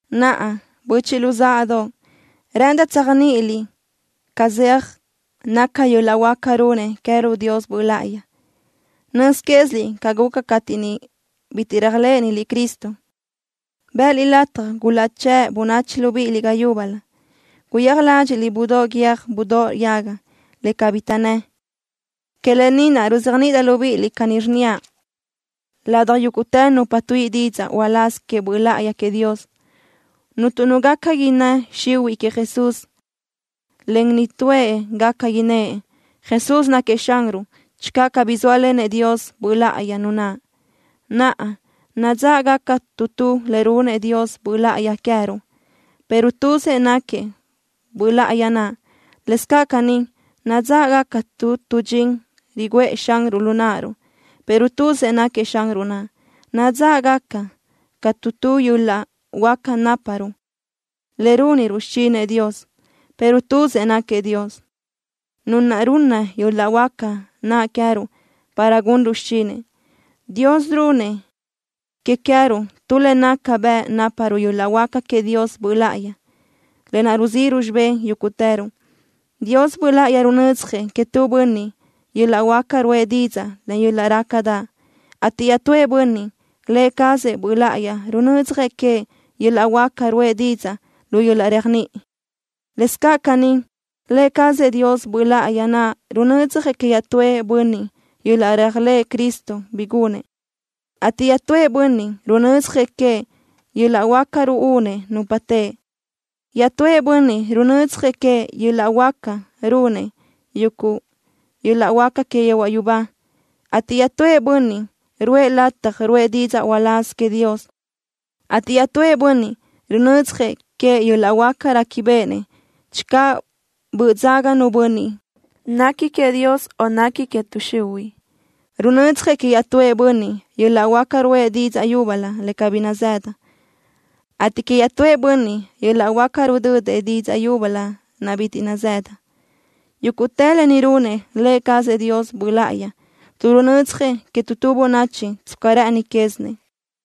Naʼa, böchiʼ luzáʼadoʼ, rë́ʼëndaʼ tséajniʼiliʼ ca zeaj naca yöl-laʼ huáca runnëʼ queë́ruʼ Dios Böʼ Láʼayi. Nöz quéziliʼ ca guca cateʼ niʼ bitiʼ réajlëʼëniliʼ Cristo, bë́ʼëliʼ lataj gulaʼchë́ʼ bönachi libíʼiliʼ ga yúbölö. Guyéaj ládxiʼliʼ budóʼ guiö́j budóʼ yaga, le cabí taʼnnë́. Que lë ni naʼ, ruzéajniʼidaʼ libíʼiliʼ caní, rnníaʼ: Ladaj yúguʼtë nupa tuíʼi didzaʼ uláz queëʼ Böʼ Láʼayi queëʼ Dios, cuntu nu gaca innë́ xihuiʼ queëʼ Jesús, en nitúëʼ gaca innë́ʼ: “Jesús náquiëʼ Xanruʼ”, channö cabí zóalenëʼ Dios Böʼ Láʼayi nu naʼ. Naʼa, nadzáʼgaca tu tu le runnëʼ Dios Böʼ Láʼayi queë́ruʼ, pero tuzëʼ náquiëʼ Böʼ Láʼayi naʼ. Lëscaʼ caní, nadzáʼgaca tu tu dxin riguʼë Xanruʼ lu náʼaruʼ, pero tuzëʼ náquiëʼ Xanruʼ naʼ. Nadzáʼgaca caʼ tu tu yöl-laʼ huáca náparuʼ le rúniruʼ xichinëʼ Dios, pero tuzëʼ náquiëʼ Dios, Nu naʼ runna yöl-laʼ huáca naʼ queë́ruʼ para gunruʼ xichinëʼ. Dios runnëʼ que queë́ruʼ tu le naca bëʼ náparuʼ yöl-laʼ huáca queëʼ Dios Böʼ Láʼayi, lë naʼ ruzíʼiruʼ xibé yúguʼtëruʼ. Dios Böʼ Láʼayi runödzjëʼ queëʼ tu bönniʼ yöl-laʼ huáca ruʼë didzaʼ len yöl-laʼ rácadaʼ, ateʼ iaʼtúëʼ bönniʼ, Lë cazëʼ Böʼ Láʼayi runödzjëʼ queëʼ yöl-laʼ huáca ruʼë didzaʼ lu yöl-laʼ réajniʼi. Lëscaʼ caní, Lë cazëʼ Dios Böʼ Láʼayi naʼ runödzjëʼ queëʼ iaʼtúëʼ bönniʼ yöl-laʼ réajlëʼ Cristo bi gunëʼ, ateʼ iaʼtúëʼ bönniʼ runödzjëʼ queëʼ yöl-laʼ huáca ruúnëʼ nupa teʼe. Iaʼtúëʼ bönniʼ runödzjëʼ queëʼ yöl-laʼ huáca runëʼ yuguʼ yöl-laʼ huáca que yehuaʼ yubá, ateʼ iaʼtúëʼ bönniʼ ruʼë lëʼ lataj ruʼë didzaʼ uláz queëʼ Dios, ateʼ iaʼtúëʼ bönniʼ runödzjëʼ queëʼ yöl-laʼ huáca réquibeʼenëʼ channö böʼ dzaga nu bönniʼ nequi queëʼ Dios, o nequi que tuʼ xihuiʼ. Runödzjëʼ queëʼ iaʼtúëʼ bönniʼ yöl-laʼ huáca ruʼë didzaʼ yúbölö le cabí nazëdëʼ, ateʼ queëʼ iaʼtúëʼ bönniʼ yöl-laʼ huáca rudödëʼ didzaʼ yúbölö naʼ bitiʼ nazëdëʼ. Yúguʼtë lë ni runëʼ Lë cazëʼ Dios Böʼ Láʼayi, tuʼ runödzjëʼ que tu tu bönachi tsca rë́ʼëni quézinëʼ.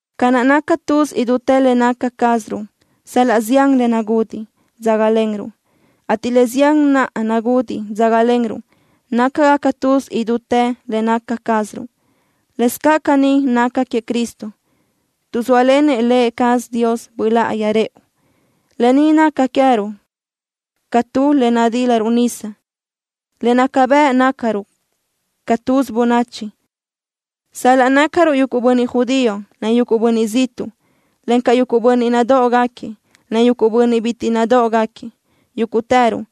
Ca naʼ naca tuz idútë le naca cázaruʼ, sal-laʼ zián le nagudiʼ dzágalenruʼ, ateʼ le zián naʼ nagudiʼ dzágalenruʼ nácagaca tuz idútë le naca cázaruʼ, lëscaʼ caní naca queëʼ Cristo. Tuʼ zóalenëʼ Lë cazëʼ Dios Böʼ Láʼayi rëʼu, lë ni naca queë́ruʼ ca tu le nadílaruʼ nisa, le naca bëʼ nácaruʼ ca tuz bönachi, sal-laʼ nácaruʼ yuguʼ bönniʼ judío, en yuguʼ bönniʼ ziʼtuʼ, encaʼ yuguʼ bönniʼ nadóʼogaquiëʼ, en yuguʼ bönniʼ bitiʼ nadóʼogaquiëʼ. Yúguʼtëruʼ,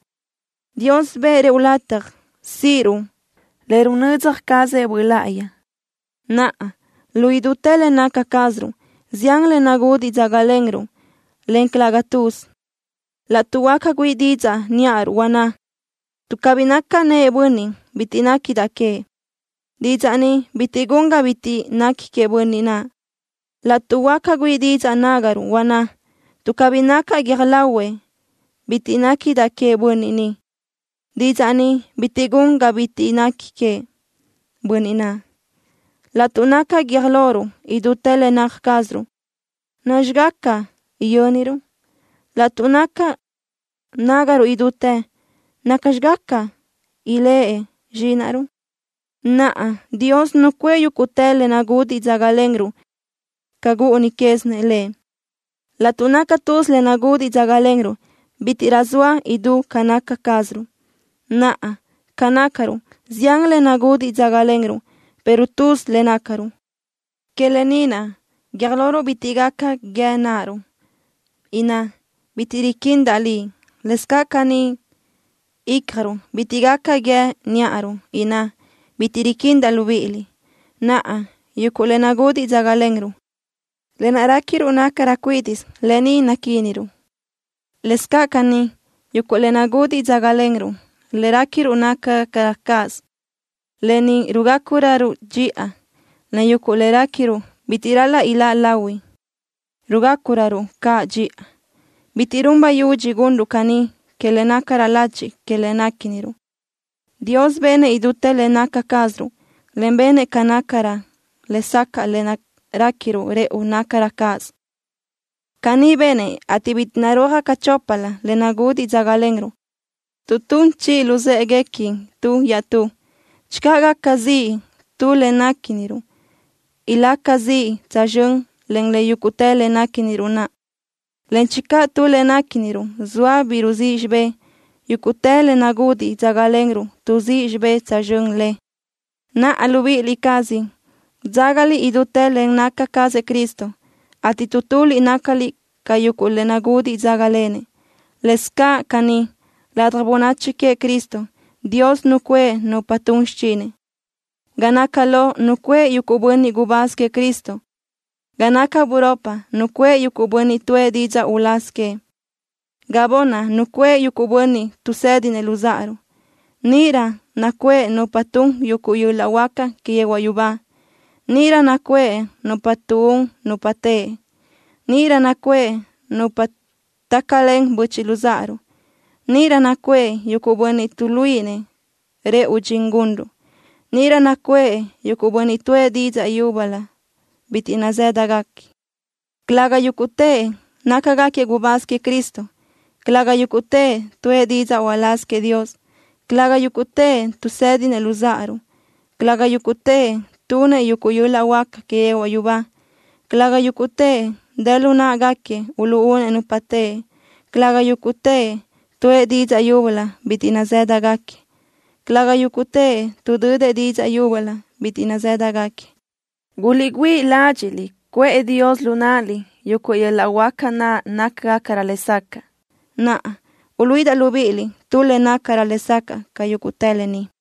Dios bëʼë rëʼu lataj síʼiruʼ le runödzja cazëʼ Böʼ Láʼayi. Naʼa, lu idútë le naca cázaruʼ, zián le nagudiʼ dzágalenruʼ, en calëga tuz. Laʼtuʼ huáca güíʼi didzaʼ níʼaruʼ, huanná: “Tuʼ cabí nacaʼ nëʼë bönniʼ, bitiʼ néquidaʼ queëʼ”, didzaʼ ni bitiʼ gun ga bitiʼ nequi queëʼ bönniʼ naʼ. Laʼtuʼ huáca güíʼi didzaʼ nágaruʼ, huanná: “Tuʼ cabí nacaʼ guiö́j lahuëʼ, bitiʼ néquidaʼ queëʼ bönniʼ ni”, didzaʼ ni bitiʼ gun ga bitiʼ nequi queëʼ bönniʼ naʼ. Laʼtuʼ naca guiö́j loruʼ idútë le naca cázaruʼ, ¿nacxi gaca yö́niruʼ? Laʼtuʼ naca nágaruʼ idútë, ¿nacxi gaca iléʼe zxínaʼruʼ? Naʼa, Dios nucuʼë yúguʼtë le nagudiʼ dzágalenruʼ ca gúʼuni quézinëʼ Lëʼ. Laʼtuʼ naca tuz le nagudiʼ dzágalenruʼ, bítiʼrö soa idú ca naca cázaruʼ. Naʼa, ca nácaruʼ, zián le nagudiʼ dzágalenruʼ, pero tuz le nácaruʼ. Que lë ni naʼ, guiö́j loruʼ bitiʼ gaca guíë náʼaruʼ, inná: “Bitiʼ riquindaʼ liʼ.” Lëscaʼ caní, ícjaruʼ bitiʼ gaca guíë níʼaruʼ, inná: “Bitiʼ riquindaʼ libíʼiliʼ.” Naʼa, yuguʼ le nagudiʼ dzágalenruʼ, lë naʼ réquiruʼ nácagacarö cuídiʼsö, lë ni naquíniröruʼ. Lëscaʼ caní, yuguʼ le nagudiʼ dzágalenruʼ, le réquiruʼ nácagacarö cáʼasö, lë ni rugácuröruʼ dxiʼa, en yuguʼ le réquiruʼ bitiʼ ral-laʼ iláʼ lahui, rugácuröruʼ caʼ dxiʼa. Bitiʼ run bayudxi gunruʼ caní que le nácarö lachi que le néquiniruʼ. Dios benëʼ idútë le naca cázaruʼ, en benëʼ ga nácarö lesacaʼ lë naʼ réquiruʼ rëʼu nácarö cáʼasö. Caní benëʼ, ateʼ bitiʼ narúajgaca choplö le nagudiʼ dzágalenruʼ, tuʼ tun chiʼi luzë́ʼeguequi tu iaʼtú. Channö gaca ziʼ tu le néquiniruʼ, ilaca ziʼ tsözxö́n len le yúguʼtë le néquiniruʼ naʼ, en channö tu le néquiniruʼ zoa bi ruzíʼ xibé, yúguʼtë le nagudiʼ dzágalenruʼ tuʼzí xibé tsözxö́n le. Naʼa, libíʼi cázaliʼ dzágaliʼ idútë le naca cazëʼ Cristo, ateʼ tu tuliʼ nácaliʼ ca yuguʼ le nagudiʼ dzágalenëʼ. Lëscaʼ caní, ladaj bönachi queëʼ Cristo, Dios nucuʼë nupa tun xichinëʼ. Ga naca lo nucuʼë yuguʼ bönniʼ gubáz queëʼ Cristo. Ga naca buropi nucuʼë yuguʼ bönniʼ tuʼë didzaʼ uláz queëʼ. Ga bunni nucuʼë yuguʼ bönniʼ tuʼsédinëʼ luzáʼaruʼ. Níʼirö nucuʼë nupa tun yuguʼ yöl-laʼ huáca que yehuaʼ yubá. Níʼirö nucuʼë nupa tuʼún nupa teʼe. Níʼirö nucuʼë nupa tácalen böchiʼ luzáʼaruʼ. Níʼirö nucuʼë yuguʼ bönniʼ tuʼluíʼinëʼ rëʼu dxin gunruʼ. Níʼirö nucuʼë yuguʼ bönniʼ tuʼë didzaʼ yúbölö bitiʼ nazë́dagaquiëʼ. Calëga yúguʼtëʼ nácagaquiëʼ gubáz queëʼ Cristo. Calëga yúguʼtëʼ tuʼë didzaʼ uláz queëʼ Dios. Calëga yúguʼtëʼ tuʼsédinëʼ luzáʼaruʼ. Calëga yúguʼtëʼ tunëʼ yuguʼ yöl-laʼ huáca que yehuaʼ yubá. Calëga yúguʼtëʼ dë lu náʼagaquiëʼ uluʼúnëʼ nupa teʼe. Calëga yúguʼtëʼ tuʼë didzaʼ yúbölö bitiʼ nazë́dagaquiëʼ. Calëga yúguʼtëʼ tuʼdödëʼ didzaʼ yúbölö bitiʼ nazë́dagaquiëʼ. Guliʼgüíʼ ládxiʼliʼ cuʼë Dios lu náʼaliʼ yuguʼ yöl-laʼ huáca naʼ nácagacarö lesacaʼ. Naʼa, uluíʼidaʼ libíʼiliʼ tu le nácarö lesacaʼ ca yúguʼtë lë ni.